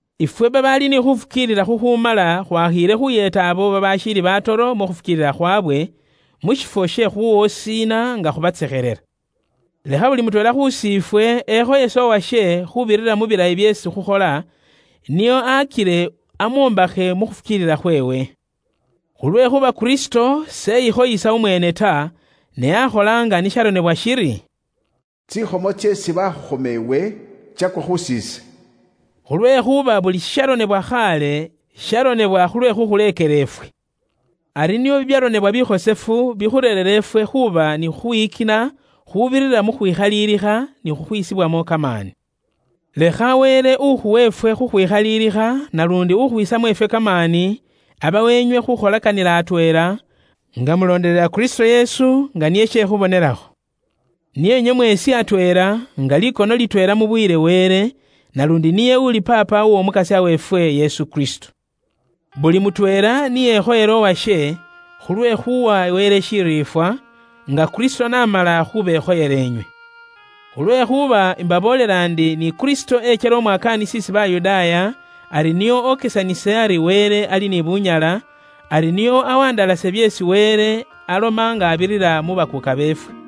Ifwe babaali ni khuufukiilila khukhumala khwakhiile khuuyeeta abo babaashiili batoro mu khufukiilila khwaabwe, mu shifwo she khuuwosiina nga khubatsekhelela. Lekha buli mutweela khus'ifwe ekhoyese uwashe khuubirira mu bilayi byeesi khukhola, nio akile amwombakhe mu khufukiilila khweewe. Khulwekhuuba Kristo s'eyikhoyesa umweene ta, ne akhola nga ni sharonebwa shiri, “Tsikhomo tseesi bakhukhoma iwe, tsakwa khus'ise.” Khulwekhuuba buli shisharonebwa khaale, sharonebwa khulwe khuukhuleekela ifwe. Ari nio bibyaronebwa bikhosefu bikhureere ifwe khuba ni khukhwiyikina khuubirira mu khwikhalilikha ni khukhwisibwamo kamaani. Lekha Wele ukhuwa ifwe khukhwikhalilikha naluundi ukhwisamo ifwe kamaani, abawe inywe khukholakanila atweela, nga mulondelela Kristo Yesu, nga niye she khubonelakho. Nio inywe mweesi atweela, nga likono litweela mubuyile Wele, naluundi niye uli Paapa w'Omukasya weefwe, Yesu Kristo. Buli mutweela ni ekhoyele uwashe, khulwe khuuwa Wele shiriifwa, nga Kristo n'amala khubekhoyela inywe. Khulwekhuuba imbaboolela inywe ndi ni Kristo ekyela umwakaanisi isi Bayudaaya ari nio okesanise bwa ŋali bwa Wele, ari nio awandalase byeesi Wele aloma nga abirira mu bakuuka beefwe.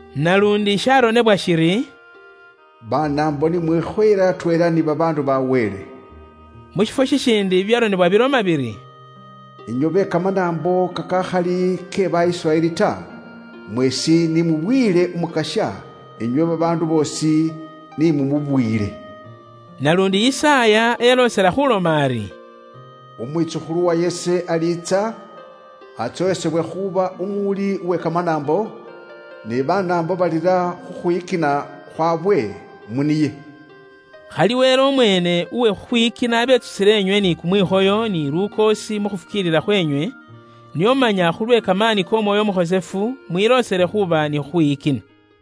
Naluundi sharonebwa shiri, “Banaambo ni mwikhoyele atweela ni babaandu ba Wele.” Mu shifwo shishiindi bibyaronebwa biloma biri, “Inywe be Kamanaambo kakakhali ke ba Isiraeli ta, mweesi ni mubuyile Umukasya; inywe babaandu boosi ni mumubuyile.” Naluundi Yisaaya eloosela khuloma ari, “Umwitsukhulu uwa Yese aliitsa, atsowesebwe khuuba umuwuli uwe kamanaambo, ni Banaambo balira khukhwiyikina khwaabwe mu niye.” Khali Wele umweene uwe khukhwiyikina abetsusile inywe ni kumwikhoyo, ni lukoosi mu khufukiilila khwenywe, nio manya khulwe kamaani k'Omwoyo Umukhosefu mwiloosele khuuba ni khukhwiyikina.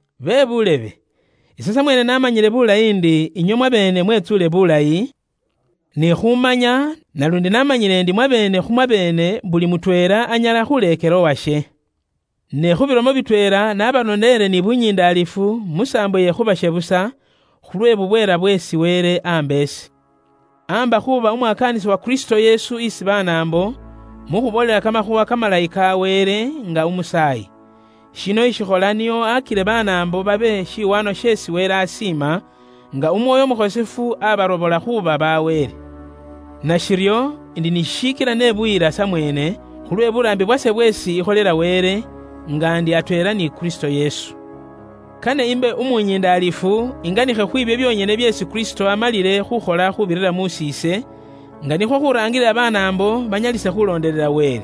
Bebuulebe, ise samweene ishihandalasa ndi inywe mwabeene mwetsuule buulayi, ni khumanya, naluundi namanyile ndi mwabeene khu mwabeene buli mutweela anyala khuleekela uwashe. Ne khu bilomo bitweela naabaronele ni bunyindaalifu mu saambo iye khubashebusa, khulwe bubweela bweesi Wele amba ise. Amba ise khuuba umwakaanisi wa Kristo Yesu isi Banaambo, mu khuboolela Kamakhuuwa Kamalayi ka Wele, nga umusaayi. Shino ise ishikhola nio akile Banaambo babe shiwaanwa sheesi Wele asiima, nga Umwoyo Umukhosefu abarobola khuuba ba Wele. Nashiryo indi ni shishikila nebuyila samweene khulwe buraambi bwase bweesi ikholela Wele, nga ndi atweela ni Kristo Yesu. Kane imbe umunyindalifu inganikhe khwibyo byonyene byeesi Kristo amalile khukhola khuubirira mus'iise, nga nikhwo khuraangilila Banaambo banyalisa khulondelela Wele.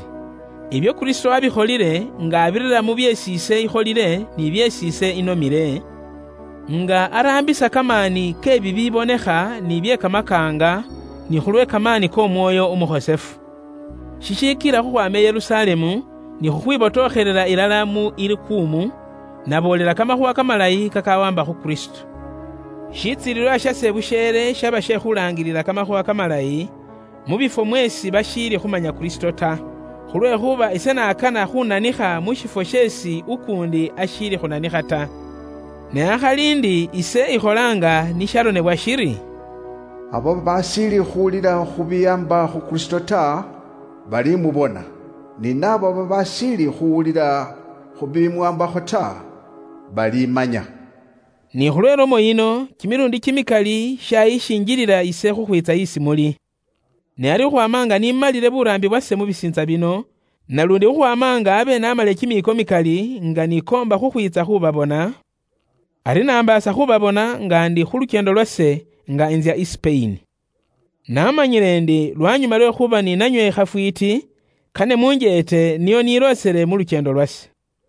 Ibyo Kristo wabikholile nga abirira mu byeesi ise ikholile ni byeesi ise inomile, nga araambisa kamaani ke bibibonekha ni bye kamakaanga, ni khulwe kamaani k'Omwoyo Umukhosefu. Shishikila khukhwaama i Yerusalemu, ni khukhwibotokhelela ilala mu Ilikumu, naboolela Kamakhuuwa Kamalayi kakawaamba khu Kristo. Shitsilililwa shase busheele shaba she khulaangilila kamakhuuwa kamalayi, mu bifwo mweesi bashiili khumanya Kristo ta. Khulwekhuuba ise nakana khunanikha mu shifwo sheesi ukuundi ashiili khunanikha ta. Ne akhali ndi ise ikhola nga ni sharonebwa shiri, “Abo babaashiili khuwulila khu biwaamba khu Kristo ta, bali mubona, ni naabo babaashiili khuwulila khu bimuwaambakho ta, balimanya.” Ni khulwe ilomo yino, kimiluundi kimikali shayishinjilila ise khukhwiitsa isi muli. Ne ari khukhwaama nga ni malile buraambi bwase mu bisiintsa bino, naluundi khukhwaama nga abe namalile kimiiko mikali nga nikoomba khukhwiitsa khu babona, ari nambaasa khubabona nga ndi khu lukyeendo lwase, nga intsya i Sipeyini. Namanyile ndi lwanyuma lwe khuuba ni nanywe khafwiiti, kane munjeete nio niloosele mu lukyeendo lwase.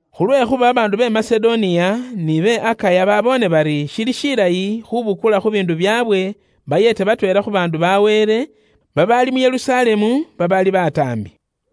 Khulwekhuuba babaandu be Masedoniya ni be Akaya baboone bari shili shilayi khubukula khu biindu byaabwe bayeete batweela khu bakhosefu ba Wele babaali mu Yerusalemu babaali bataambi.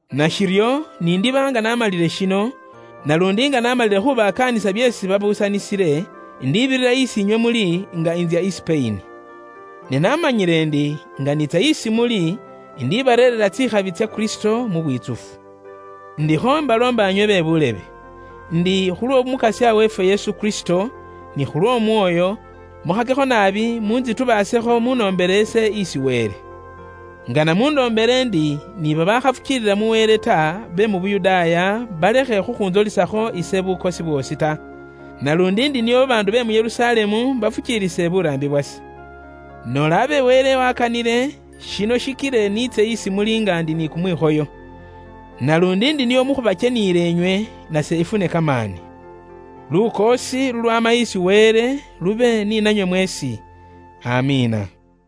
Nashiryo nindiba nga namalile shino, naluundi nga namalile khubakaanisa byeesi babaabuusanisiile, indibirira isi inywe muli nga intsya i Sipeyini. Ne namanyile ndi nga niitsa isi muli, indibareereera tsikhabi tsya Kristo mu bwitsufu. Indikho mbaloomba inywe be buulebe, indi khulw'Omukasya weefwe Yesu Kristo, ni khuukana khweesi Umwoyo areera, mukhakekho naabi muntsitubaasekho munoombele ise isi Wele. Ise ingana munoombele indi ni babaakhafukiilila mu Wele ta be mu Yuda balekhe khukhuntsolisakho ise bukosi bwoosi ta. Naluundi ndi nio bakhosefu ba Wele be Yerusalemu bafukiilise buraambi bwase. Noola abe Wele wakanile, shino shikile niitse isi muli nga ndi ni kumwikhoyo. Naluundi ndi nio mu khubakyeniyila inywe, nase ifune kamaani. Lukoosi lulwaama isi Wele lube ni nanywe mweesi. Amiina.